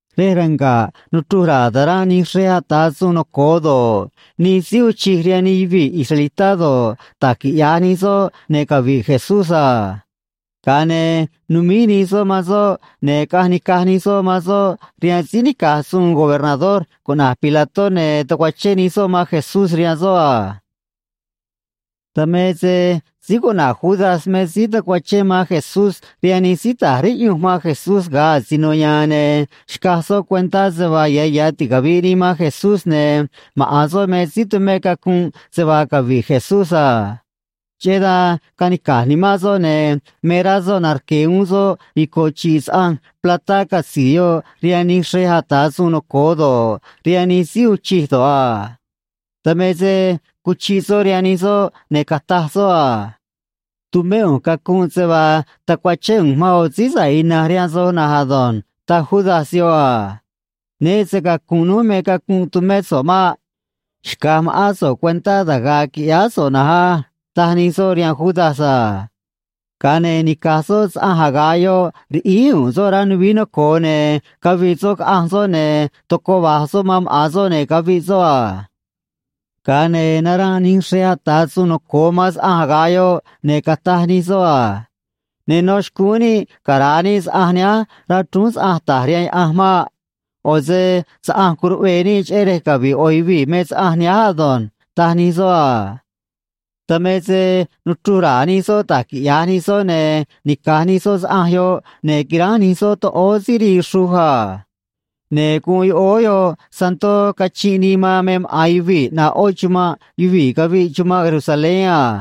Rej ranga̱ꞌ nuchruj ra̱a̱ taranꞌ nij xrej ata̱ suun noco̱o doj do̱ꞌ, nij síí uun chij do̱ꞌ, da̱j quiꞌya̱j nij soꞌ, ne̱ cavi̱ꞌ Jesucristó a. Ga̱a ne̱ numíj nij soꞌ man soꞌ, ne̱ nica̱j nij soꞌ man soꞌ caꞌanj nij soꞌ rihaan síí nica̱j suun gobernador cuꞌna̱j Pilato, ne̱ tacuachén nij soꞌ man Jesucristó rihaan soꞌ a. Dan me se síí cuꞌna̱j Judas me síí tacuachén man Jesucristó rihaan nij síí ta̱j riꞌyunj man Jesucristó ga̱a asino ya̱a̱n, ne̱ xcaj soꞌ cuentá se vaa ya̱ ya̱ ticavi̱ꞌ nii man Jesucristó ne̱ maꞌa̱n soꞌ me síí tumé cacunꞌ se vaa cavi̱ꞌ Jesucristó a. Cheꞌé dan nanó ndoꞌo rá soꞌ, ne̱ me rá soꞌ narque̱ uún soꞌ ico̱ chi̱ꞌ saꞌanj platá catzi̱i̱ yoꞌ rihaan nij xrej ata̱ suun noco̱o doj do̱ꞌ, rihaan nij síí uun chij do̱ꞌ a. Dan me se cuchiꞌ soꞌ rihaan nij soꞌ, ne̱ cataj soꞌ: ―Tumé ꞌu̱nj cacunꞌ se vaa tacuachén ꞌu̱nj man yoꞌo̱ síí sa̱ꞌ ina̱nj rihaan soj á ―taj síí cuꞌna̱j Judas yoꞌ a. ―Nuveé se‑cacu̱nꞌ núj me cacunꞌ tumé so̱ꞌ maꞌ. Xca̱j ma̱ꞌán so̱ꞌ cuentá da̱j ga̱a̱ qui̱ꞌyáá so̱ꞌ ei ―taj nij soꞌ rihaan síí cuꞌna̱j Judas a. Ga̱a ne̱ nica̱j soꞌ saꞌanj aga̱ꞌ yoꞌ, riꞌíj u̱u̱n soꞌ rá nuvií noco̱o, ne̱ cavii soꞌ caꞌanj soꞌ, ne̱ tocoꞌ va̱j maꞌa̱n soꞌ man soꞌ, ne̱ caviꞌ soꞌ a. Ga̱a ne̱ naranꞌ nij xrej ata̱ suun noco̱o doj man saꞌanj aga̱ꞌ yoꞌ, ne̱ cataj nij soꞌ: ―Ne nó xcúún níꞌ cara̱a níꞌ saꞌanj nihánj rá chrúún saꞌanj ta̱j rihaan Diose̱ maꞌ. ꞌO̱ se saꞌanj goꞌ níꞌ cheꞌé rej cavi̱ꞌ yoꞌo̱ yuvii̱ me saꞌanj nihánj á ―taj nij soꞌ a. Dan me se nuchruj ra̱a̱ nij soꞌ da̱j quiꞌya̱j nij soꞌ, ne̱ nica̱j nij soꞌ saꞌanj yoꞌ, ne̱ quiránj nij soꞌ toꞌóó síí rii xruj a. Ne̱ guun yoꞌóó yoꞌ santó cachinꞌ nii man náá guun yuvii̱ ꞌnaꞌ yoꞌó chumanꞌ yuvii̱ caviꞌ chumanꞌ Jerusalén a.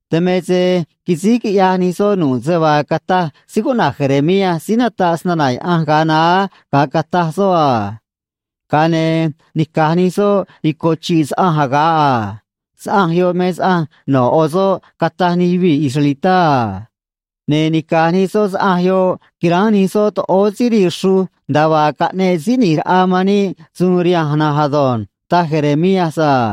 Dan me se quisíj quiꞌyaj nij soꞌ nu̱ꞌ se vaa cataj síí cuꞌna̱j Jeremías síí nataꞌ se‑na̱na̱ Diose̱ ga̱a naá ga̱a cataj soꞌ: “Ga̱a ne̱ nica̱j nij soꞌ ico̱ chi̱ꞌ saꞌanj aga̱ꞌ a. Saꞌanj yoꞌ me saꞌanj no̱ yoꞌo̱ soꞌ, cataj nij yuvii̱ israelitá a. Ne̱ nica̱j nij soꞌ saꞌanj yoꞌ quiránj nij soꞌ toꞌóó síí rii xruj, nda̱a vaa cataj xnaꞌanj síí ꞌni̱j raꞌa man níꞌ rihanj na̱nj ado̱nj”, taj síí cuꞌna̱j Jeremías a.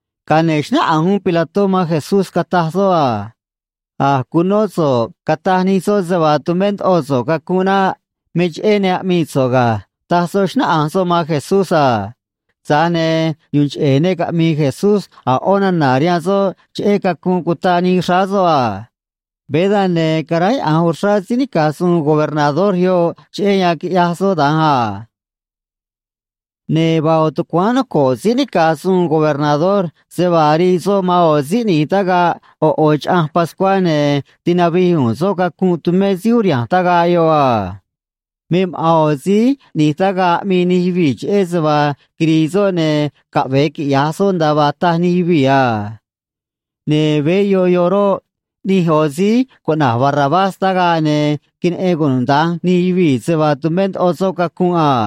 Ga̱a ne̱ xnáꞌanj uún síí nica̱j suun yoꞌ man Jesucristó, cataj soꞌ: ―A̱j cunó so̱ꞌ cataj nij soꞌ se vaa tumé so̱ꞌ cacunꞌ naꞌ. Me cheꞌé ne aꞌmii so̱ꞌ ga̱ ―taj soꞌ, xnáꞌanj soꞌ man Jesucristó a. Tza̱j ne̱ yu̱u̱n cheꞌe̱ ne caꞌmi̱i̱ Jesucristó a̱ ꞌó nana̱ rihaan soꞌ cheꞌé cacunꞌ cutaꞌ nii xráá soꞌ a. Veé dan, ne̱ caráyaꞌa̱nj uxrá síí nica̱j suun gobernador yoꞌ cheꞌé yan quiꞌyaj soꞌ da̱nj a. Ne̱ vaa yoꞌo̱ tucuáán noco̱ꞌ síí nica̱j suun gobernador se vaa rii soꞌ man yoꞌo̱ síí ꞌni̱j tagaꞌ ꞌo̱ ꞌo̱ chaꞌanj pascuá, ne̱ tinavij u̱u̱n soꞌ cacunꞌ tumé síí uriha̱nj tagaꞌ yoꞌ a. Me maꞌa̱n ꞌo̱ síí ꞌni̱j tagaꞌ aꞌmii nij yuvii̱ cheꞌé se vaa quiri̱i̱ soꞌ, ne̱ caꞌve̱e quiꞌya̱j soꞌ nda̱a vaa taj nij yuvii̱ a. Ne̱ veé yoꞌ yoꞌ roꞌ, ꞌni̱j yoꞌo̱ síí cuꞌna̱j Barrabás tagaꞌ, ne̱ queneꞌen cunuda̱nj nij yuvii̱ se vaa tumé ndoꞌo soꞌ cacunꞌ a.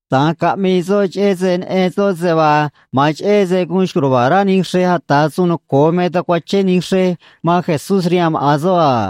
Da̱nj caꞌmii soꞌ, neꞌen soꞌ se vaa ma̱a̱n cheꞌé se guun xco̱j ruva̱a̱ rá nij xrej ata̱ suun noco̱o doj me tacuachén nij xrej man Jesucristó rihaan maꞌa̱n soꞌ a.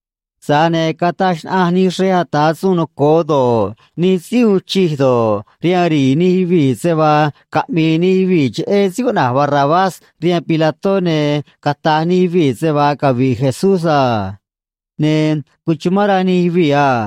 Tza̱j ne̱ cataj xnaꞌanj nij xrej ata̱ suun noco̱o doj do̱ꞌ, nij síí uun chij do̱ꞌ, rihaan nij yuvii̱ se vaa caꞌmi̱i̱ nij yuvii̱ cheꞌé síí cuꞌna̱j Barrabás rihaan síí cuꞌna̱j Pilato, ne̱ cata̱j nij yuvii̱ se vaa cavi̱ꞌ Jesucristó a. Ne̱ cuchumán rá nij yuvii̱ a.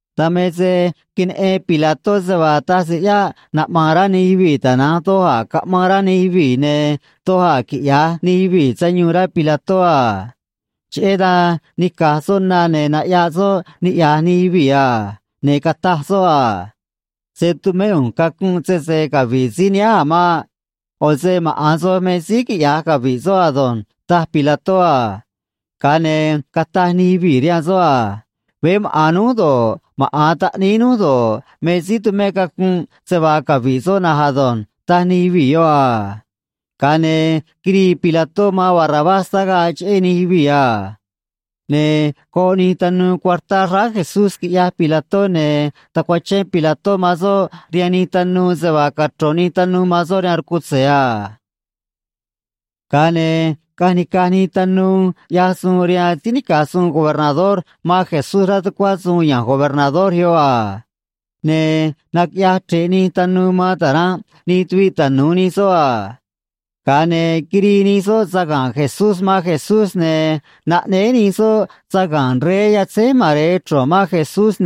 Dan me se queneꞌen síí cuꞌna̱j Pilato se vaa taj se ꞌyáꞌ quinaꞌma̱a̱n rá nij yuvii̱, ne̱ ma̱a̱n se doj a̱ caꞌma̱an rá nij yuvii̱, ne̱ doj a̱ quiꞌya̱j nij yuvii̱ sayuun a. Cheꞌé dan nica̱j soꞌ na, ne̱ naꞌyaꞌ soꞌ niꞌya̱j nij yuvii̱ a. Ne̱ cataj soꞌ: ―Se̱ tumé ꞌu̱nj cacunꞌ sese cavi̱ꞌ síí nihánj a̱ maꞌ. ꞌO̱ se maꞌa̱n soj me síí quiꞌya̱j cavi̱ꞌ soꞌ ado̱nj ―taj síí cuꞌna̱j Pilato a. Ga̱a ne̱ cataj nij yuvii̱ rihaan soꞌ a: ―Veé maꞌa̱n núj, maꞌa̱n taꞌníí núj do̱ꞌ, me síí tu̱mé cacunꞌ se vaa cavi̱ꞌ soꞌ ei ―taj nij yuvii̱ yoꞌ a. Ga̱a ne̱ quirii síí cuꞌna̱j Pilato man síí cuꞌna̱j Barrabás tagaꞌ cheꞌé nij yuvii̱, ne̱ goꞌ nij tanuu cuartá xráá Jesucristó, quiꞌyaj síí cuꞌna̱j Pilato, ne̱ tacuachén síí cuꞌna̱j Pilato man soꞌ rihaan nij tanuu se vaa cachro̱n nij tanuu man soꞌ rihaan rcutze̱ a. Ga̱a ne̱ caꞌanj nica̱j nij tanuu ꞌyaj suun rihaan síí nica̱j suun gobernador man Jesucristó rá veꞌ tucuá síí nica̱j suun gobernador yoꞌ a. Ne̱ naquiꞌyaj chre̱ꞌ nij tanuu man taranꞌ nij tuviꞌ tanu̱u nij soꞌ a. Ga̱a ne̱ quirii nij soꞌ saga̱nꞌ Jesucristó man Jesucristó, ne̱ naꞌnéé nij soꞌ saga̱nꞌ rey yatzíj mare̱e man Jesucristó,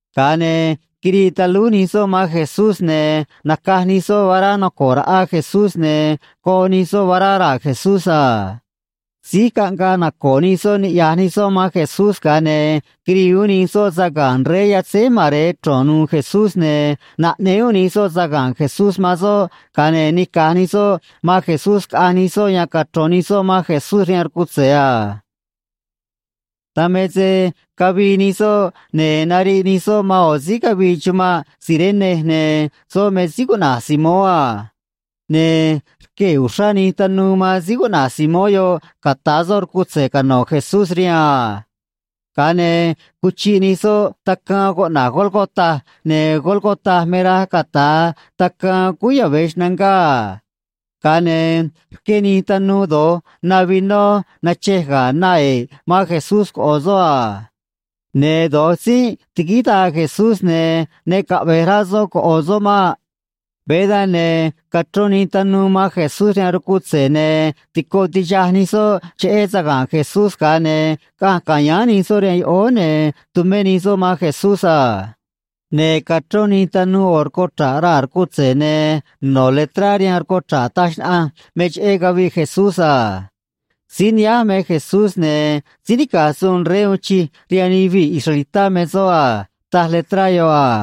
Ga̱a ne̱ quirii talúj nij soꞌ man Jesucristó, ne̱ nacaj nij soꞌ vará noco̱ꞌ raꞌa Jesucristó, ne̱ goꞌ nij soꞌ vará raa̱ Jesucristó a. Síj caꞌngaꞌ naco̱o̱ nij soꞌ niꞌya̱j nij soꞌ man Jesucristó, ga̱a ne̱ quirii uún nij soꞌ saga̱nꞌ rey yatzíj mare̱e nu̱u̱ Jesucristó, ne̱ naꞌnéé uún nij soꞌ saga̱nꞌ uún Jesucristó man uún soꞌ, ga̱a ne̱ nica̱j nij soꞌ man Jesucristó cavii nij soꞌ caꞌanj nij soꞌ yan cachro̱n nij soꞌ man Jesucristó rihaan rcutze̱ a. Dan me se cavii nij soꞌ, ne̱ nariꞌ nij soꞌ man yoꞌo̱ síí ne̱ chumanꞌ Cirene, ne̱ soꞌ me síí cuꞌna̱j Simón a. Veé dan, ne̱ quiꞌyaj uxrá nij tanuu fuerzá man síí cuꞌna̱j Simón yoꞌ ca̱ta̱ soꞌ rcutze̱ cano̱ Jesucristó rihaan a. Ga̱a ne̱ cuchiꞌ nij soꞌ tacaan cuꞌna̱j Gólgota, ne̱ Gólgota roꞌ, me rej cuꞌna̱j Tacaan Cúú Yave̱ Xnangá a. Ga̱a ne̱ rqué nij tanuu do̱j na vinó nachej ga̱ na e̱ꞌ man Jesucristó coꞌo̱ soꞌ a. Ne̱ do̱j tzinꞌ tiguíj daa Jesucristó, ne̱ ne caꞌve̱j rá soꞌ coꞌo̱ soꞌ maꞌ. Veé dan, ne̱ cachrón nij tanuu man Jesucristó rihaan rcutze̱, ne̱ tico tixaj nij soꞌ cheꞌé saga̱nꞌ Jesucristó, ga̱a ne̱ caꞌanj cane̱ nij soꞌ rihaan yoꞌóó, ne̱ tumé nij soꞌ man Jesucristó a. Ne̱ cachrón nij tanuu yoꞌo̱ rcuchra̱ꞌ raa̱ rcutze̱, ne̱ no̱ letrá rihaan rcuchra̱ꞌ yoꞌ, ne̱ taj xnaꞌanj letrá yoꞌ me cheꞌé caviꞌ Jesucristó, ne̱: “Síí nihánj me síí cuꞌna̱j Jesucristó, ne̱ síí nica̱j suun rey uun chij rihaan nij yuvii̱ israelitá me soꞌ a”, taj letrá yoꞌ a.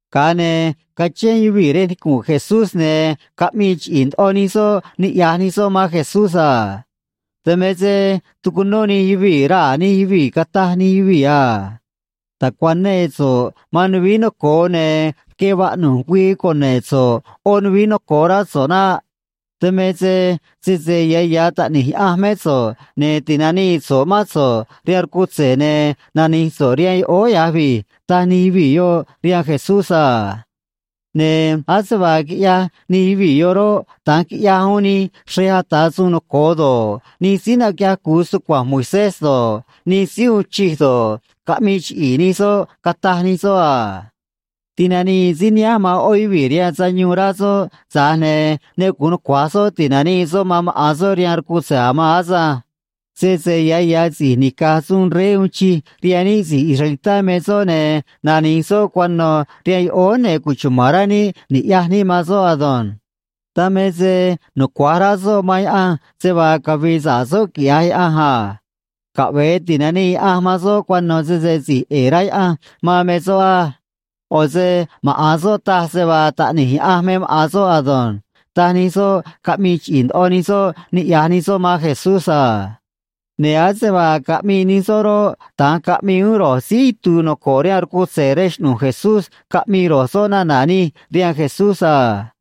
Ga̱a ne̱ cachén yuvii̱ rej nicu̱nꞌ Jesucristó, ne̱ caꞌmii chiꞌi̱i̱ ndoꞌo nij soꞌ niꞌya̱j nij soꞌ man Jesucristó a. Dan me se tucunó nij yuvii̱ raa̱ nij yuvii̱, cataj nij yuvii̱: ―Ta̱cuanee so̱ꞌ man nuvií noco̱o, ne̱ rque vaꞌnu̱j güii cune̱ꞌ so̱ꞌ yoꞌó nuvií noco̱o, rá so̱ꞌ naꞌ. Dan me se sese ya̱ ya̱ taꞌni̱j Diose̱ mé so̱ꞌ, ne̱ ti̱nanii so̱ꞌ mán so̱ꞌ rihaan rcutze̱, ne̱ nani̱j so̱ꞌ rihaan yoꞌóó ya̱j vi̱j ―taj nij yuvii̱ rihaan Jesucristó a. Ne̱ ase vaa quiꞌyaj nij yuvii̱ yoꞌ roꞌ, da̱nj quiꞌyaj uún nij xrej ata̱ suun noco̱o doj do̱ꞌ, nij síí naquiꞌyaj cu̱u se‑tucua̱nj Moisés do̱ꞌ, nij síí uun chij do̱ꞌ, caꞌmii chiꞌi̱i̱ nij soꞌ, cataj nij soꞌ: ―Ti̱nanii síí nihánj man yoꞌó yuvii̱ rihaan sayuun, rá soꞌ, tza̱j ne̱ ne gu̱un nucua̱j soꞌ ti̱nanii soꞌ man maꞌa̱n soꞌ rihaan rcutze̱ danj. Sese ya̱ ya̱ si̱j nica̱j suun rey uun chij rihaan níꞌ si̱j israelitá me soꞌ, ne̱ nani̱j soꞌ cuano̱ rihaan yoꞌóó, ne̱ cuchuma̱n rá níꞌ ni̱ꞌyaj níꞌ man soꞌ ei. Dan me se nucua̱j rá soꞌ man Diose̱ se vaa cavi̱i̱ sa̱ꞌ soꞌ, quiꞌya̱j Diose̱, rá soꞌ a. Caꞌve̱e ti̱nanii Diose̱ man soꞌ cuano̱, sese si̱j ꞌe̱e̱ rá Diose̱ man me soꞌ á. ꞌO̱ se maꞌa̱n soꞌ taj se vaa taꞌni̱j Diose̱ me maꞌa̱n soꞌ ado̱nj ―taj nij soꞌ, chiꞌi̱i̱ ndoꞌo caꞌmii nij soꞌ niꞌya̱j nij soꞌ man Jesucristó a. Ne̱ ase vaa caꞌmii nij soꞌ roꞌ, da̱nj caꞌmii uún ro̱j síí itu̱u̱ noco̱ꞌ rihaan rcutze̱ rej xꞌnu̱j Jesucristó, caꞌmii ro̱j soꞌ nana̱ nij rihaan Jesucristó a.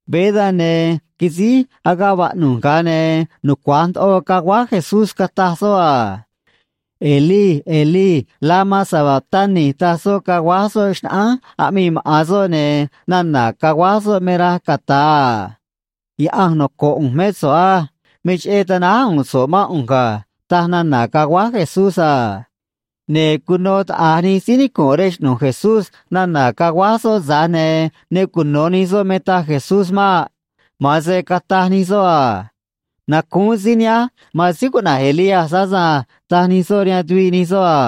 Veé dan, ne̱ quisíj agaꞌ vaꞌnu̱j, ga̱a ne̱ nucua̱j ndoꞌo caguáj Jesucristó, cataj soꞌ: ―Elí, Elí, lama sabactani ―taj soꞌ, caguáj soꞌ xnaꞌánj aꞌmii maꞌa̱n soꞌ, ne̱ nana̱ caguáj soꞌ taj: “Diose̱ noco̱ꞌ ꞌu̱nj mé so̱ꞌ á. Me cheꞌé tanáj u̱u̱n so̱ꞌ mán ꞌu̱nj ga̱”, taj nana̱ caguáj Jesucristó a. Ne̱ cuno taꞌa̱j nij síí nicu̱nꞌ rej xꞌnu̱j Jesucristó nana̱ caguáj soꞌ, tza̱j ne̱ ne cuno̱ nij soꞌ me taj Jesucristó maꞌ. Ma̱a̱n se: ―Nacúún síí nihánj man síí cuꞌna̱j Elías tado̱nj ―taj nij soꞌ rihaan tuviꞌ nij soꞌ a.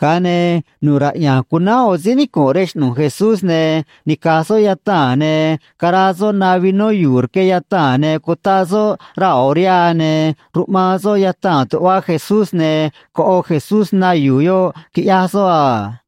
Ga̱a ne̱ nu̱ꞌ raꞌya̱nj cunánj yoꞌo̱ síí nicu̱nꞌ rej xꞌnu̱j Jesucristó, ne̱ nica̱j soꞌ yataa̱n esponja, ne̱ caraa soꞌ na vinó yu̱u̱ rque yataa̱n, ne̱ cutaꞌ soꞌ raa̱ yoꞌo̱ vará, ne̱ ruꞌmaan soꞌ yataa̱n tuꞌva Jesucristó, ne̱ coꞌo Jesucristó na yu̱u̱ yoꞌ, quiꞌyaj soꞌ a.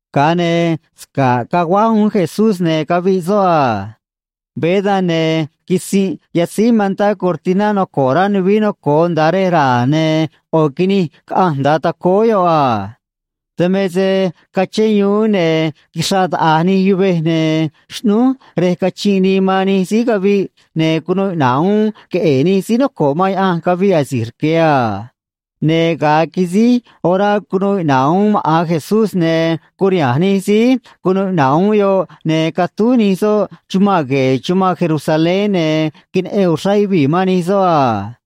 Ga̱a ne̱ sca̱ꞌ caguáj uún Jesucristó, ne̱ caviꞌ soꞌ a. Veé dan, ne̱ quisinꞌ yatzíj mantá cortiná noco̱ꞌ rá nuvií noco̱o nda̱a rej ra̱a̱, ne̱ ꞌo̱ quinij caꞌanj nda̱a tacóó yoꞌ a. Dan me se cachén yuún, ne̱ quixraꞌ taꞌa̱j nij yuvej, ne̱ xꞌnúj rej cachinꞌ nii man nij síí caviꞌ, ne̱ cunuu iꞌna̱ꞌ uún queꞌe̱e̱ nij síí sa̱ꞌ caviꞌ asi̱j rque̱ a. Ne̱ ga̱a quisíj orá cunuu iꞌna̱ꞌ uún maꞌa̱n Jesucristó, ne̱ curiha̱nj nij síí cunuu iꞌna̱ꞌ uún yoꞌ, ne̱ catúj nij soꞌ chumanꞌ gue̱e̱ chumanꞌ Jerusalén, ne̱ queneꞌen uxrá yuvii̱ man nij soꞌ a.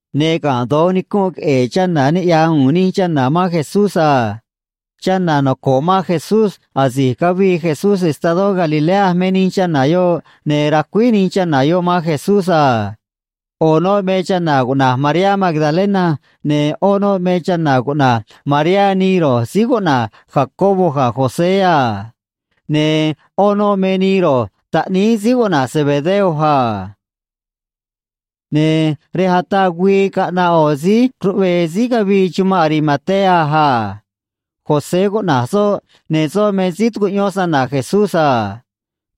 Ne̱ ga̱nꞌ doj nicunꞌ queꞌe̱e̱ chana̱, niꞌya̱j u̱u̱n nij chana̱ man Jesucristó a. Chana̱ cuno se‑na̱na̱ Jesucristó asi̱j cavii Jesucristó estadó Galilea me nij chana̱ yoꞌ, ne̱ quiꞌyaj suun nij chana̱ yoꞌ cheꞌé Jesucristó a. Yoꞌo̱ noꞌ me chana̱ cuꞌna̱j Mariá Magdalena, ne̱ yoꞌó noꞌ me chana̱ cuꞌna̱j Mariá nii síí cuꞌna̱j Jacobo ga̱ síí cuꞌna̱j José a. Ne̱ yoꞌó noꞌ me nii ro̱j taꞌníí síí cuꞌna̱j Zebedeo a. Ne̱ rej ataꞌ güii caꞌnaꞌ yoꞌo̱ síí ruꞌvee síí ne̱ chumanꞌ Arimatea a. José cuꞌna̱j soꞌ, ne̱ soꞌ me síí tucuꞌyón se‑na̱na̱ Jesucristó a.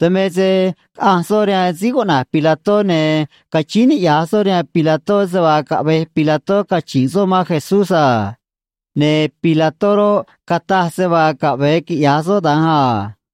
Dan me se caꞌanj soꞌ rihaan síí cuꞌna̱j Pilato, ne̱ cachíín niꞌya̱j soꞌ rihaan síí cuꞌna̱j Pilato se vaa caꞌve̱j síí cuꞌna̱j Pilato cachi̱nꞌ soꞌ man Jesucristó a. Ne̱ síí cuꞌna̱j Pilato roꞌ, cataj se vaa caꞌve̱e quiꞌya̱j soꞌ da̱nj a.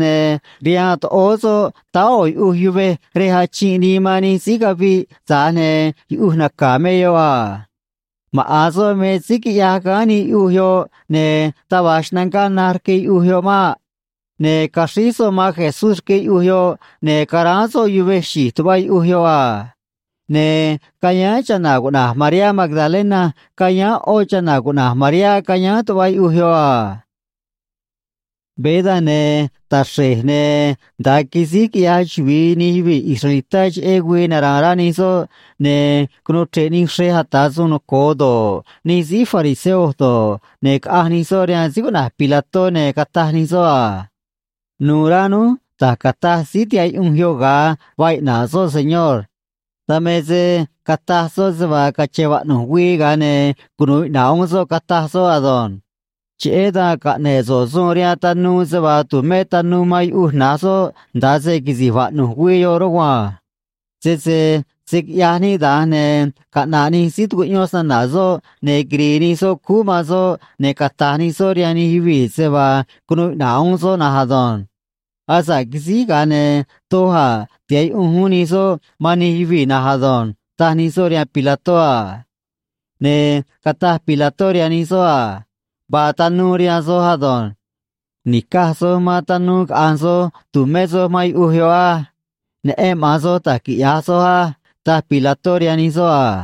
ne̱ vaa yuꞌuj yuvej rihaan soꞌ, rej achinꞌ nii man nij síí caviꞌ, tza̱j ne̱ yuꞌuj naca̱ me yoꞌ a. Maꞌa̱n soꞌ me síí quiꞌyaj gáán nii yuꞌuj yoꞌ, ne̱ taj va̱j xnangá na̱j rque yuꞌuj maꞌ. Ne̱ caxríj soꞌ man Jesucristó rque yuꞌuj yoꞌ, ne̱ caráán soꞌ yuvej xi̱j tuꞌva yuꞌuj yoꞌ a. Ne̱ cayáán chana̱ cuꞌna̱j Mariá Magdalena cayáán yoꞌó chana̱ cuꞌna̱j Mariá cayáán tuꞌva yuꞌuj yoꞌ a. Veé dan, ne̱ taxre̱j, ne̱ nda̱a quisíj quiꞌyaj chuvi̱i nij yuvii̱ israelitá cheꞌé güii nara̱a̱n rá nij soꞌ, ne̱ cunuu chre̱ꞌ nij xrej ata̱ suun noco̱o doj do̱ꞌ, nij síí fariseo do̱ꞌ, ne̱ caꞌanj nij soꞌ rihaan síí cuꞌna̱j Pilato, ne̱ cataj nij soꞌ: ―Nu̱u̱ rá núj da̱j cataj síí tihaꞌ yuꞌunj yoꞌ ga̱a gaa iꞌna̱ꞌ soꞌ, señor. Dan me se cataj soꞌ se vaa cache̱n vaꞌnu̱j güii, ga̱a ne̱ cunu̱u iꞌna̱ꞌ uún soꞌ, cataj soꞌ ado̱nj. Cheꞌé dan caꞌne̱ꞌ so̱ꞌ suun rihaan tanuu se vaa tu̱mé tanuu man yuꞌuj na̱j soꞌ nda̱a se quisi̱j vaꞌnu̱j güii yoꞌ rugua̱nj. Sese se̱ quiꞌyaj níꞌ da̱nj, ne̱ caꞌna̱ꞌ nij síí tucuꞌyón se‑na̱na̱ soꞌ, ne̱ quiri̱i̱ nij soꞌ man soꞌ, ne̱ cata̱j nij soꞌ rihaan nij yuvii̱ se vaa cunuu iꞌna̱ꞌ uún soꞌ na̱nj ado̱nj. Asa̱ꞌ quisíj, ga̱a ne̱ doj a̱ tiha̱ꞌ yuꞌunj uún nij soꞌ man nij yuvii̱ na̱nj ado̱nj ―taj nij soꞌ rihaan síí cuꞌna̱j Pilato a. Ne̱ cataj síí cuꞌna̱j Pilato rihaan nij soꞌ a: ―Vaa tanuu rihaan soj ei. Ni̱caj soj man tanuu caꞌa̱nj soj cu̱tumé soj man yuꞌuj yoꞌ á. Neꞌen maꞌa̱n soj da̱j quiꞌya̱j soj á ―taj Pilato rihaan nij soꞌ a.